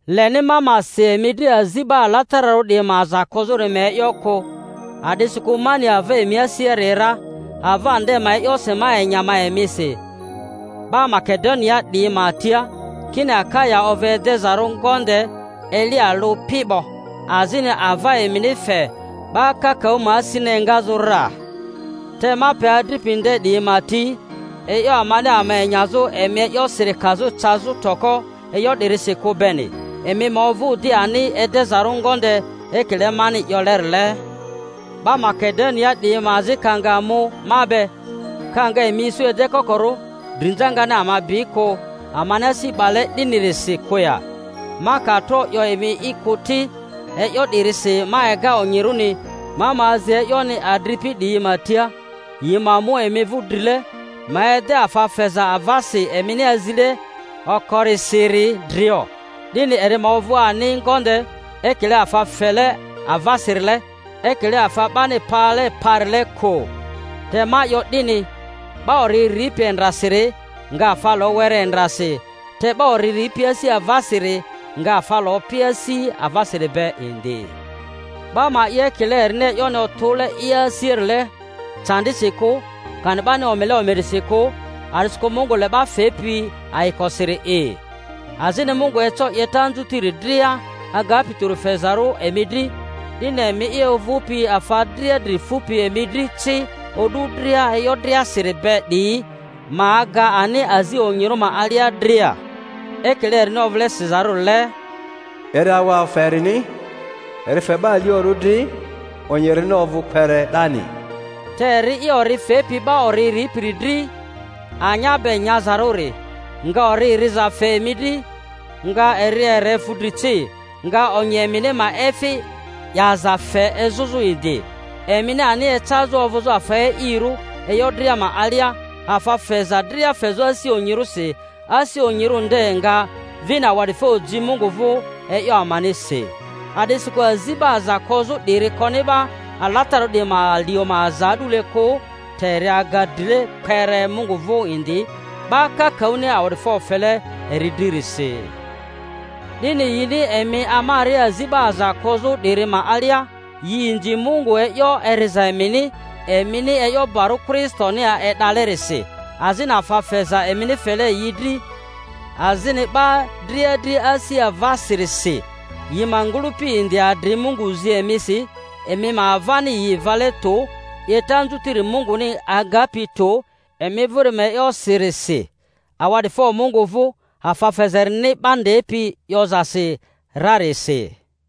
Leni ma ma si emi dri azi 'ba alatararᴜ 'diyi ma aza kozᴜri ma e'yo kᴜ, a'disikᴜ ma ni ava emi asiari ra, ava nde ma e'yosi ma enya ma emisi 'ba Makedoniaa 'diyi ma tia, kini Akaya ovᴜ edezarᴜ ngonde eli alᴜ pi 'bo; azini ava emini fe 'ba kakaᴜ ma asini engazᴜ ra. Te ma pe adripi nde 'diyi ma ti, e'yo amani ama enyazᴜ emi ma e'yosiri kazᴜ cazᴜ toko e'yo 'dirisi kᴜ beni, emi ma ovᴜ di ani edezarᴜ ngonde ekile mani 'yolerile; 'ba Makedoniaa 'diyi ma azi ka nga mu ma be, ka nga emi isu edekokorᴜ, drinza ngani ama bi kᴜ amani asi 'bale 'dinirisi kᴜ ya? (ma ka tro 'yo emi'i kᴜ ti). E'yo 'dirisi ma ega onyirᴜni ma ma azi e'yoni adripi 'diyi ma tia yi ma mu emi vᴜ drile, ma ede afa feza avasi emini azile okorisiri drio, 'dini eri ma ovᴜ ani ngonde, ekile afa fele avasirile, ekile afa 'bani pale parile kᴜ. Te ma 'yo 'dini: 'ba ori ripi endrasiri nga afa lo were endrasi, te 'ba ori ripi asi avasiri nga afa lo pi asi avasiri be indi. 'Ba ma 'ye ekile erini e'yoni otᴜle i asiarile, candisi kᴜ, kani 'bani omile omirisi kᴜ, a'disikᴜ Mungu le 'ba fepi ayikosiri'i. Azini Mungu eco 'yeta anzutiri dria agapi tᴜri fezarᴜ emi dri, 'dini emi'i ovᴜpi afa dria dri fupi emi dri ci o'du dria e'yo driasiri be 'diyi, ma aga ani azi onyirᴜ ma alia dria. Ekile erini ovᴜle sizarᴜrile, Eri awa afa erini, eri fe 'ba aliorᴜ dri; onyi erini ovᴜ kpere 'dani. Te eri'i ori fepi 'ba ori ripiri dri, anya be nyazarᴜri, nga ori riza fe emi dri, nga eri ere fudri ci, nga onyi emini ma efi 'yaza fe ezᴜzᴜ indi; emini ani ecazᴜ ovᴜzᴜ afa e'irᴜ e'yo dria ma alia, afa feza dria fezᴜ asi onyirᴜsi, asi onyirᴜ nde nga vini awa'difo ji Mungu vᴜ e'yo amanisi. A'disikᴜ azi 'ba aza kozᴜ 'diri koni 'ba alatararᴜ 'diyi ma alio ma aza a'dule kᴜ, te eri aga drile kpere Mungu vᴜ indi, 'ba kakaᴜni awa'difo fele eri dririsi. 'Dini yini emi amaria azi 'ba aza kozᴜ 'diri ma alia, yi inzi Mungu e'yo eriza emini, emini e'yo barᴜ Kristoni e'dalerisi, azini afa feza emini fele yi dri azini 'ba dria dri asi avasirisi; yi ma ngᴜlᴜpi indi adri Mungu zi emisi, emi ma avani yi vale tᴜ, 'yeta anzutiri Munguni agapi tᴜ emi vᴜri ma e'yosirisi. Awa'difo Mungu vᴜ afa feza erini 'ba ndepi 'yozasi rarisi!